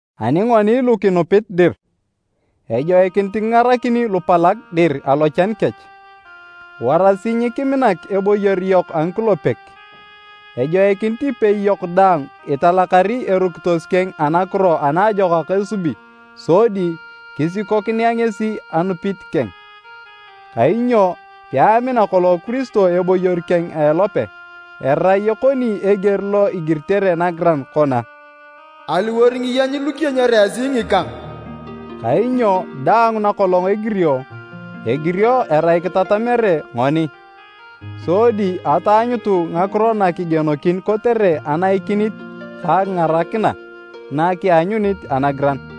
Ani ngoni lu kinupit dir, ejoikinit kingarakini lupalag dir alochan kech. Warasi nyikiminak eboyor yok a ngikulepek. Ejoikinit ipei yok daang italakari erukitos keng anakiro anaajokak esubi sodi kisikokinea ngesi anupit keng. Kainyo peamina kolong Kiristo eboyor keng a elope, erai ekoni eger lo igiritere nagiran kona, “Aliwor ngiyeny lu kiyenyere esi ngikang.” Kainyo daang nakolong egirio, egirio erai kitatamere ngoni, sodi ataanyutu ngakiro na kigienokin kotere anaikinit ka akingarakina na kianyunit anagiran.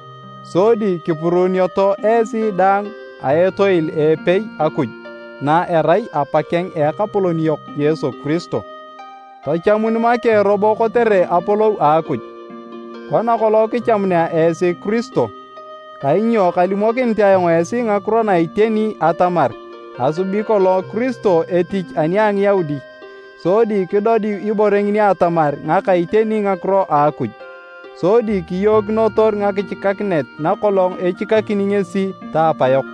sodi kipuruunioto esi daang a etoil a epei Akuj na erai Apakeng a Ekapolon yok Yesu Kiristo. Tachamun make robo kotere apolou a Akuj, kona kolong kichamunea esi Kiristo. Kainyo kalimokinit ayong esi ngakiro na iteni atamar asubi kolong Kiristo etich ani a Ngiyaudi, sodi kidodiu ibore ngini atamar ngaka iteni ngakiro a Akuj. Sodi kiyookinotor ngakichikakinet nakolong echikakini ngesi ta apayok,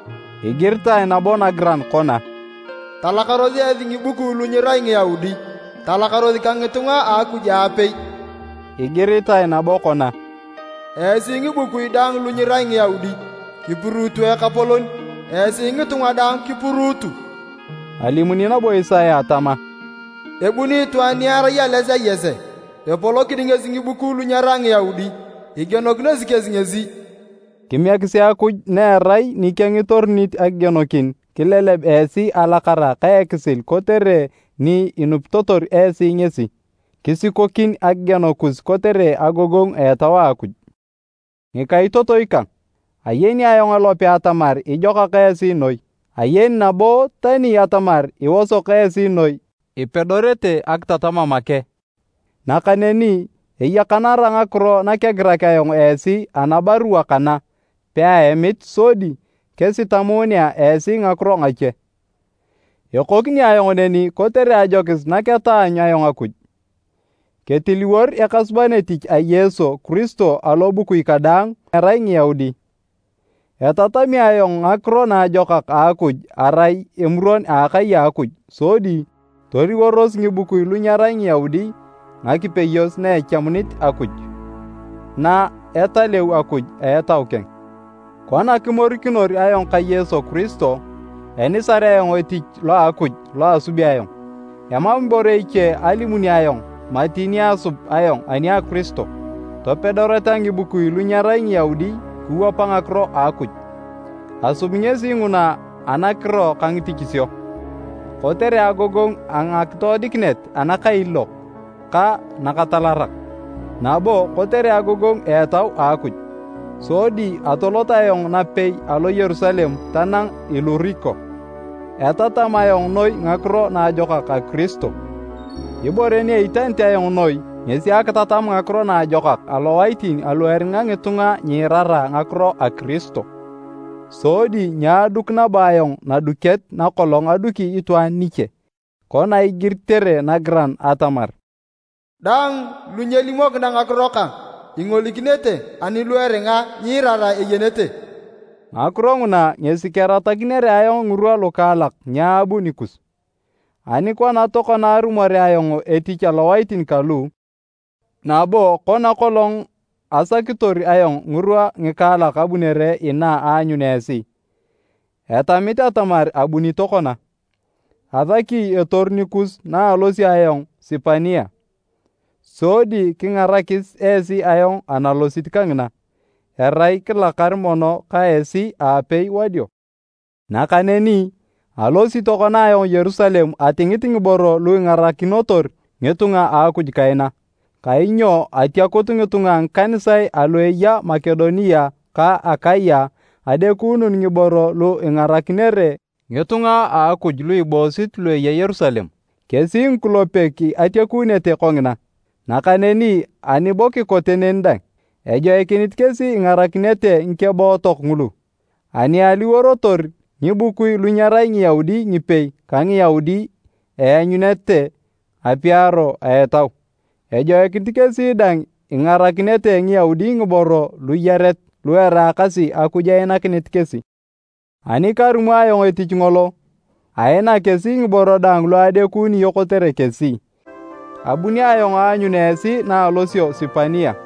Igiritae nabo nagiran kona, “Talakaros esi ngikubui lu nyirai Ngiyaudi, talakaros ka ngitunga a Akuj aapei!” Igiritae nabo kona, “Esi ngibukui daang lu nyirai Ngiyaudi, kipuruutu Ekapolon, esi ngitunga daang kipuruutu!” Alimuni nabo Isaya tama, “Ebuni itwaan ni erai ales a Yese, epolokini ngesi ngibukui lu nyerai Ngiyaudi, igienokinosi kesi ngesi.” Kimiekisi Akuj na erai nikeng itorunit akigienokin kileleb esi alakara ka ekisil kotere ni inupitotor esi ngesi. Kisikokin akigieno kus kotere agogongu a Etau a Akuj. Ngikaitotoi kang, ayeni ayong elope atamar ijokak esi noi, ayeni nabo tani atamar iosok esi noi ipedorete akitatama make. Nakaneni eyakanara ngakiro nakegirak ayong esi anabarua kana peaemit sodi kesitamunea esi ngakiro ngache. Ekokini ayong neni kotere ajokis naketaanyu ayong Akuj ketiliwor ekasuban etich a Yesu Kiristo alobukui kadaang alu nyerai Ngiyaudi. Etatami ayong Ngakiro Naajokak a Akuj arai emuron a akai a Akuj sodi toliworos ngibukui lu nyerai Ngiyaudi ngakipeyos na echamunit Akuj, na etaleu Akuj a Etau keng. Kona kimorikinor ayong ka Yesu Kiristo, enisar ayong etich lo a Akuj lo asubi ayong. Emam ibore iche alimuni ayong mati ni asub ayong ani a Kiristo, topedoreta ngibukui lu nyerai Ngiyaudi kiwapa ngakiro a Akuj. Asubi ngesi nguna anakiro ka ngitichisio, kotere agogongu a ngakitoodikinet anakailiilok ka nakatalarak, nabo kotere agogongu a Etau a Akuj. Sodi atolot ayong napei alo Yerusalem tanang Iluriko, etatam ayong noi Ngakiro Naajokak a Kiristo. Ibore ni eitanit ayong noi ngesi akitatam Ngakiro Naajokak alowaitin alu eringa ngitunga nyiirara ngakiro a Kiristo, sodi nyaaduk nabo ayong naduket nakolong aduki itwaan niche. Kona igiritere nagiran atamar, “Daang lu nyelimokina ngakiro kang ingolikinete, ani lu eringa nyiirara eyenete.” Ngakiro nguna ngesi keratakinere ayong ngirwa lukaalak nyaabu nikus. Ani kona tokona arumorea ayong etich alowaitin kalu, nabo kona kolong asakitor ayong ngirwa ngikaalak abunere inaa aanyun esi, etamit atamar abuni tokona. Asaki etoru nikus naalosio ayong Sipania, sodi kingarakis esi ayong analosit kangina, erai kilakar mono ka esi aapei wadio. Nakaneni, alosi tokona ayong Yerusalem atingit ngiboro lu ingarakinotor ngitunga a Akuj kaina. Kainyo atiakut ngitunga a ngikanisae alu eya Makedonia ka Akaya adekuunun ngiboro lu ingarakinere ngitunga a Akuj lu iboosit lu eya Yerusalem. Kesi ngikulepek atiakunete kongina, nakaneni ani bo kikote neni dang, ejoikinit kesi ingarakinete ngikebootok ngulu. Ani aliworotor ngibukui lu nyerai Ngiyaudi ngipei ka Ngiyaudi eanyunete apiaro a Etau, ejoikinit kesi dang ingarakinete Ngiyaudi ngiboro luyaret lu eraakasi Akuj einakinit kesi. Ani karumo ayong etich ngolo, ainak kesi ngiboro daang lu adekunio kotere kesi, abuni ayong aanyun esi naalosio Sipania.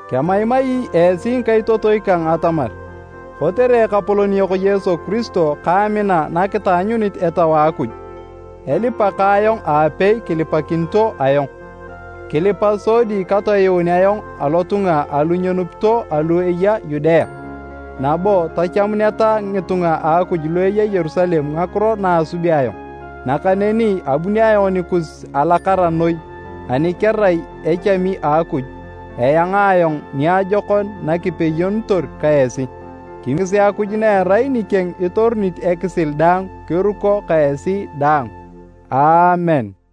Kemaimai esi ngikaitotoi kang atamar, kotere Ekapolon yok Yesu Kiristo ka amina na kitaanyunit Etau a Akuj, elipa ka ayong aapei kilipakinito ayong. Kilipa sodi katoyuun ayong alotunga alu nyenupito alu eya Yudea, nabo tachamuneta ngitunga a Akuj lu eya Yerusalem ngakiro na asubi ayong. Nakaneni abuni ayong nikus alakara noi ani kerai echami a Akuj, eanga ayong niajokon nakipeyonitor ka esi. Kimiekisi Akuj na erai nikeng itorunit ekisil daang kiruko ka esi daang. Aamen.